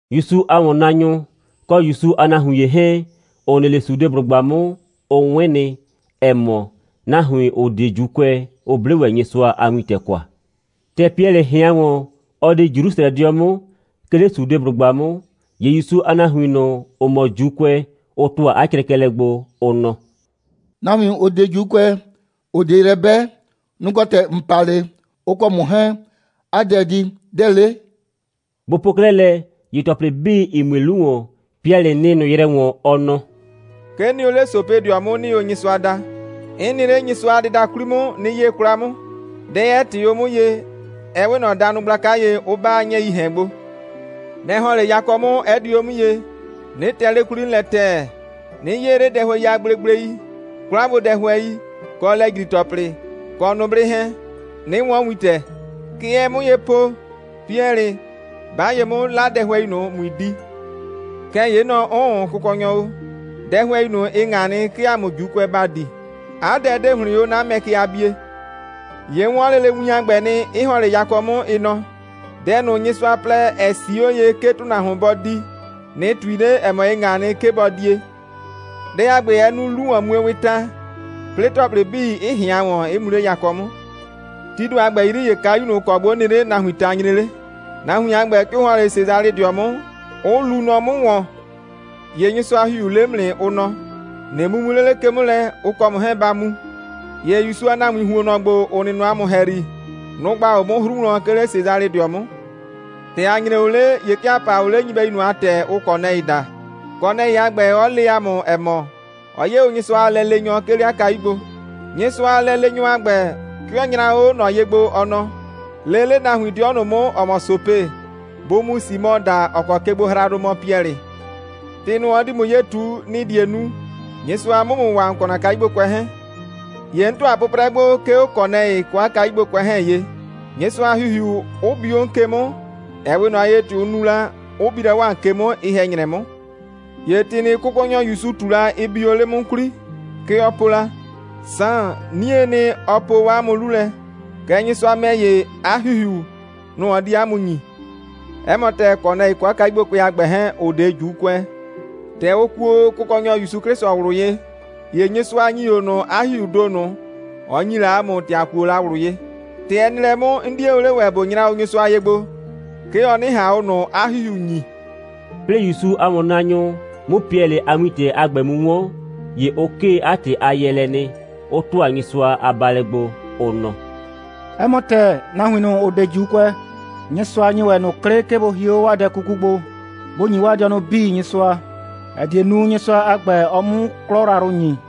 ‑Yusu a ‑wɔnnaanyʋ, kɔ ‑Yusu a nahuin ‑ye 'hɛɛn, ‑ʋ nɩ 'le Sudeblʋgba 'mʋ, ʋ 'wɩn nɩ, ‑ɛ mɔ, nahuin, ‑ʋ 'de ‑Juukʋɛ, ʋ 'ble ‑wɛ Nyɩsʋa a wintɛ kwa. ‑Tɛ Piɛlɩ ꞊hɩan ‑wɔn, ɔ di Jrusrɛdɩɔ 'mʋ, 'ke 'le Sudeblʋgba 'mʋ, ‑ye ‑Yusu a nahuin ꞊nʋ, ‑ʋ mɔ ‑Juukʋɛ, ʋ ‑tʋa 'a crɛkɛlɛ gbo, ʋ nɔ: «Nahuin, ‑ʋ 'de ‑Juukʋɛ, ‑ʋ 'de yrɛ 'bɛ, nʋ‑ kɔ ‑tɛ ‑n pa 'le, ʋ kɔ ‑mʋ 'hɛɛn 'a di dɛ. Dɛ‑ 'le?» Bʋ po 'klɛɛ lɛ, ‑ye ‑tɔplɩ 'bii, ‑ɩ mue 'lu ‑wɔn, Piɛlɩ nɩ ꞊nʋ yrɛ ‑wɔn, ɔ nɔ: «'Ke 'n nɩ o 'le Sopedɩɔ 'mʋ, 'nɩɩ o Nyɩsʋa da. 'N nɩ 'le Nyɩsʋa a dɩda 'kwli 'mʋ, 'nɩ 'yee 'kwla 'mʋ, dɛ 'ɛ ꞊tɩɩ 'o 'mʋ ye, ɛ 'we ꞊nɔ danʋ gblaka ye, 'ʋ 'ba 'a 'nyɛɛii ‑hɛn gbo. Nɛ‑ ‑hɔn 'le yakɔ 'mʋ, 'ɛ di o 'mʋ ye, 'nɩ tɛ 'le 'kwli 'mʋ lɛ ‑tɛɛ, 'nɩ 'yee 'le dɛhʋɛi a gblegblei, 'kwlagbodɛhʋɛi, kɔ lɛ‑jri‑tɔplɩ, kɔ nʋblɩ 'hɛɛn, 'nɩ 'wɔn wintɛ. Kɛ ɛɛ 'mʋ ye po: Piɛlɩ, 'ba ye 'mʋ, 'la dɛhʋɛi ꞊nʋ, ꞊mui di! Kɛɛ ‑ye 'n nɔ: 'Ʋʋn, Kʋkɔnyɔ o. Dɛhʋɛi ꞊nʋ, ɩ ꞊ŋa nɩ, 'ke ‑a mʋ ‑Juukʋɛ ‑ba di. 'A dɛ 'de ‑hlɩn 'o 'na mɛ ke a bie. ‑Ye 'n 'wɔn lele win a ‑gbɛ nɩ, 'ɩ ‑hɔn 'le yakɔ 'mʋ, ɩ nɔ: Dɛ ꞊nʋ, Nyɩsʋa plɛ, ‑ɛ 'sii 'o ye, 'ke ‑tʋnahuon bɔ di, ꞊nɩ ꞊tui 'le, ‑ɛ mɔ, ɩ ꞊ŋa nɩ, 'ke bɔ die. Dɛ a ‑gbɛ, ɛ nu 'lu‑wɔnmuewɩɩ ta, 'plɩɩ ‑tɔplɩ 'bii, 'ɩ ꞊hɩan ‑wɔn, 'ɩ mu 'le yakɔ 'mʋ. Tii ‑do a ‑gbɛ 'yri, ‑ye kayu ꞊nʋ, ‑ɔ kɔ gbo 'n nɩ 'le, nahuiin ta nyre 'le. Nahuin a ‑gbɛ, 'ke ʋ ‑hɔn 'le Sesalɩdɩɔ 'mʋ, 'ʋ luu nɔ 'mʋ ‑wɔn. ‑Ye Nyɩsʋa a ‑Hihiu le 'mʋ nɩ, ʋ nɔ: ꞊Nɩ mumu 'le ke 'mʋ lɛ, ʋ kɔ ‑mʋ 'hɛɛn ba mu. ‑Ye ‑Yusu a nahuiin ‑huonnɔ ‑gbo, ‑ʋ nɩ nɔ ‑a mʋ ‑hɛyri, nʋ‑ gba o 'mʋ 'hru wlɔn, 'ke 'le Sesalɩdɩɔ 'mʋ. ‑Tɛ ‑a nyre o 'le, ‑ye 'ke ‑a pa o 'le nyɩbɛyu ꞊nʋ a ‑tɛ, ʋʋ Kɔnɛɩ daa, Kɔnɛɩ a ‑gbɛ, 'ɔ le ‑a mʋ, ‑ɛ mɔ, ɔ 'ye o Nyɩsʋa a lɛleenyɔ, 'ke 'le 'a kayu gbo. Nyɩsʋa a lɛleenyɔ a ‑gbɛ, 'ke ɔ nyra o 'o ꞊nɔ ye gbo, ɔ nɔ: Lee 'le nahuin 'dɩɔ ꞊nʋ 'mʋ, ‑ɔ mɔ Sope, bʋ mu Simɔ da, ‑ɔ kɔ kegbohraadʋ mɔ Piɛlɩ. ‑Tɩ ꞊nʋ, ɔ di ‑mʋ ye ꞊tu, nɩ‑ die nu, Nyɩsʋa 'mʋ ‑mʋ waa, ‑n kɔ ‑na kayugbokʋɛ 'hɛɛn. ‑Ye 'n ‑tʋa o 'pʋprɛ gbo, 'ke 'o Kɔnɛɩ kɔ 'a kayugbokʋɛ 'hɛɛn ye, Nyɩsʋa a ‑Hihiu 'ʋ bi 'o ꞊nʋ ke 'mʋ, ‑ɛ 'we ꞊nʋ ye, ‑tɛ ʋ nu la, 'ʋ bi la 'o ‑a mʋ ke 'mʋ, ye‑hɛ‑nyrɛ 'mʋ. ‑Ye ‑tɩ ꞊nʋ, Kʋkɔnyɔ ‑Yusu ꞊tu la, ɩ bi o 'le 'mʋ 'mʋ 'kwli. Kɛ ɔ po la: Saan, 'niee nɩ, ɔ po 'a mʋ 'lu lɛ, kɛɛ, Nyɩsʋa ‑mɛ ‑ye, 'a ‑Hihiu, nʋ‑ ɔ di 'a mʋ ‑nyi. 'Ɛ mɔ ‑tɛɛ, Kɔnɛɩ kɔ 'a kayugbokʋɛ 'hɛɛn a ‑gbɛ, ‑ʋ 'de ‑Juukʋɛ, ‑tɛ ʋ kuo o Kʋkɔnyɔ ‑Yusu 'Klɩsʋ ꞊wlʋ ye, ‑ye Nyɩsʋa ‑nyi o ꞊nʋ 'a ‑Hihiuu ‑do ꞊nʋ, ɔ ‑nyi la ‑a mʋ, ‑tɛ ‑a kuo la ꞊wlʋ ye. ‑Tɛ ɛ nɩ lɛ 'mʋ, 'n 'die o 'le ‑wɛ, ꞊bo nyra o Nyɩsʋa ye gbo, 'ke ɔ 'nɩ ꞊han ꞊nʋ 'a ‑Hihiu ‑nyi.» 'Plɩɩ ‑Yusu a ‑wɔnnaanyʋ 'mʋ Piɛlɩ a wintɛ a ‑gbɛ mu 'wɔn, ‑ye ʋ 'kee 'a ‑tɩ a yɛɛlɛ nɩ, 'ʋ ‑tʋa Nyɩsʋa a baalɛ gbo, ʋ nɔ: «'Ɛ mɔ ‑tɛɛ, nahuin ꞊nʋ, ‑ʋ 'de ‑Juukʋɛ, Nyɩsʋa ‑nyi ‑wɛ ꞊nʋ 'klɩ, 'ke bʋ hie 'o 'waa dɛ 'kuku gbo, bʋ ‑nyi 'waa dɩɔnʋ 'bii Nyɩsʋa, ‑ɛ die nu, Nyɩsʋa a ‑gbɛ, ɔ 'mu 'klɔ yrayrʋ ‑nyi.»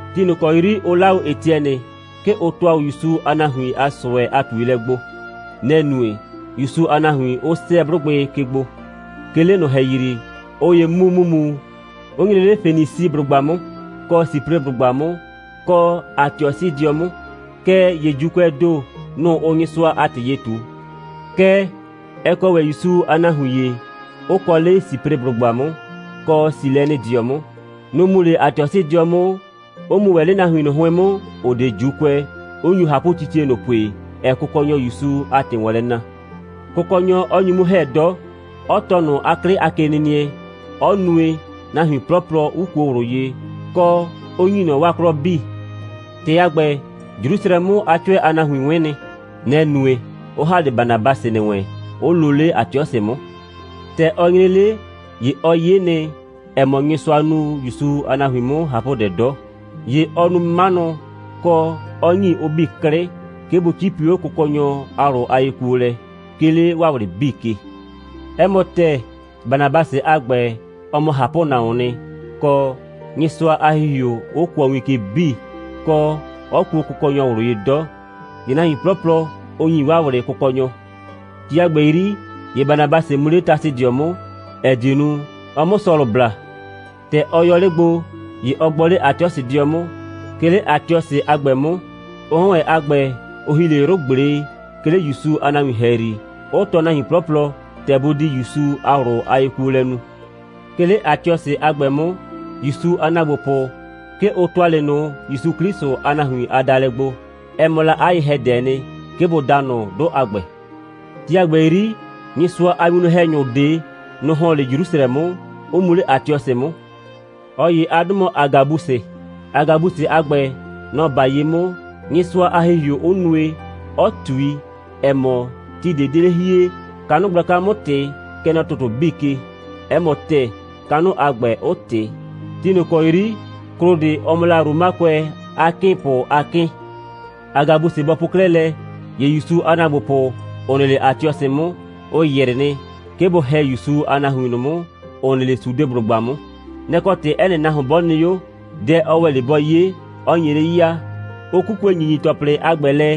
Ti ꞊nʋ ‑kɔ 'yri ʋ 'laa 'o Etiɛnɩ, 'ke ʋ ‑tʋa o ‑Yusu a nahuin a ꞊sʋɛ a ꞊tuelɛ gbo. Nɛ‑ nue, ‑Yusu a nahuin 'ʋ 'sɛɛ 'blʋgbɩ ke gbo. 'Ke 'le ꞊nʋ ‑hɛyri, ꞊ʋ ‑ye mu ‑mumu, 'ʋ nyre 'le Fenisiblʋgba 'mʋ, kɔ Sipreblʋgba 'mʋ, kɔ Atiɔsɩdɩɔ 'mʋ. Kɛɛ ‑ye ‑Juukʋɛɛ ‑do, nʋ‑ ʋʋ Nyɩsʋa a ‑tɩ ye ꞊tu. Kɛɛ, ɛ kɔ ‑wɛ ‑Yusu a nahuin ‑ye, 'ʋ kɔ 'le Sipreblʋgba 'mʋ, kɔ Silɛnɩdɩɔ 'mʋ, Nʋ‑ mu 'le Atiɔsɩdɩɔ 'mʋ, 'ʋ mu ‑wɛ 'le nahuin ꞊nʋ 'hʋɩn 'mʋ, ‑ʋ 'de ‑Juukʋɛ, 'ʋ nyu ꞊hapʋtitie ꞊nʋ pue, ‑ɛɛ Kʋkɔnyɔ ‑Yusu a ‑tɩ ‑wɔn lɛ na, Kʋkɔnyɔ 'ɔ nyu 'mʋ ‑hɛ 'dɔ, 'ɔ tɔɔ ꞊nʋ 'a 'klɩ a kenɩnɩɛ, 'ɔ nue, nahuin 'plɔplɔ 'ʋ kuo ꞊wlʋ ye, kɔ, 'ʋ ‑nyi ꞊nɔ 'waa 'klɔ 'bii. ‑Tɩ a ‑gbɛ, Jrusrɛ 'mʋ a 'cʋɛ a nahuin 'wɩn nɩ. Nɛ‑ nue, 'ʋ ‑ha 'le Banabasɩ ‑nɩ wɛn, 'ʋ loo 'le Atiɔsɩ 'mʋ. ‑Tɛ ɔ nyre 'le, ‑ye ɔ 'ye nɩ, ‑ɛ mɔ, Nyɩsʋa nu ‑Yusu a nahuin 'mʋ ꞊hapʋdɛ 'dɔ, ‑ye ɔ nu 'manʋ, kɔ, 'ɔ ‑nyi ʋ 'bii 'klɩ, 'ke bʋ 'cipi 'o Kʋkɔnyɔ a ꞊wlʋ a yekuolɛ, 'ke 'le 'waa ꞊wlɩ 'bii ke. 'Ɛ mɔ ‑tɛɛ, Banabasɩ a ‑gbɛ, ɔ mɔ ꞊hapʋnahuoon nɩ, kɔ, Nyɩsʋa a ‑Hihiu 'ʋ kʋɔ win ke 'bii, kɔ, 'ɔ kuo Kʋkɔnyɔ ꞊wlʋ ye 'dɔ. ‑Ye nahuin 'plɔplɔ, ʋ ‑nyi 'waa ꞊wlɩ Kʋkɔnyɔ. Ti a ‑gbɛ 'yri, ‑ye Banabasɩ mu 'le Tasɩdɩɔ 'mʋ, ‑ɛ die nu, ɔ 'mʋ Sɔlʋ bla. ‑Tɛ ɔ yɔ 'le gbo, ‑ye ɔ gbɔ 'le Atiɔsɩdɩɔ 'mʋ. 'Ke 'le Atiɔsɩ a ‑gbɛ 'mʋ, ʋ 'hɔn ‑wɛ a ‑gbɛ, ʋ ‑hi 'le 'yrʋ꞊gble, 'ke 'le ‑Yusu a nahuin ‑hɛyri, 'ʋ tɔɔ nahuin 'plɔplɔ, ‑tɛ bʋ di ‑Yusu a ꞊wlʋ a yekuolɛ nu. 'Ke 'le Atiɔsɩ a ‑gbɛ 'mʋ, ‑Yusu a ‑naagbopʋ, 'ke ʋ ‑tʋa 'le ꞊nʋ ‑Yusu 'Klɩsʋ a nahuin a daalɛ gbo. Ɛ mɔ la 'a ye‑hɛdɛɛ nɩ, 'ke bʋ daa ꞊nʋ 'dʋ a ‑gbɛ. Ti a ‑gbɛ 'yri, Nyɩsʋa a winwlɔn‑hɛnyʋ ꞊de, nʋ‑ ‑hɔn 'le Jrusrɛ 'mʋ, 'ʋ mu 'le Atiɔsɩ 'mʋ. ꞊Ɔ ‑ye a 'dʋ mɔ Agabusɩ. Agabusɩ a ‑gbɛ, nɔ‑ 'ba ye 'mʋ, Nyɩsʋa a ‑Hihiu 'ʋ nue, 'ɔ ꞊tui, ‑ɛ mɔ, ti ꞊de 'de 'le hie, kanʋ gblaka 'mʋ ꞊tɩ, kɛ nɔ ‑tʋtʋ 'bii ke. 'Ɛ mɔ ‑tɛɛ, kanʋ a ‑gbɛ 'ʋ ꞊tɩ, ti ꞊nʋ ‑kɔ 'yri Klodɩ, ɔ mɔ la 'o Romakʋɛ a 'kɩɩnpʋ a 'kɩɩn. Agabusɩ a ‑gbɛ bɔ po 'klɛɛ lɛ, ‑ye ‑Yusu a ‑naagbopʋ, ‑ʋ nɩ 'le Atiɔsɩ 'mʋ, ʋ ‑yrɩ nɩ, 'ke bʋ ‑hɛ ‑Yusu a nahuin ꞊nʋ 'mʋ, ‑ʋ nɩ 'le Sudeblʋgba 'mʋ. Nɛ‑ kɔ ‑tɩ 'ɛ nɩ nahuon 'bɔ nɩ 'o, dɛ ɔ ‑wɛ 'le bɔ 'ye, 'ɔ nye 'le ya, 'ʋ 'kukue ‑nyinyi‑tɔplɩ a ‑gbɛ lɛ,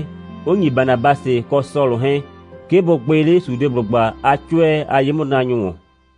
'ʋ ‑nyi Banabasɩ kɔ Sɔlʋ 'hɛɛn, 'ke bʋ gbɩ 'le Sudeblʋgba a 'cʋɛ a ye'mʋnaanyʋ ‑wɔn.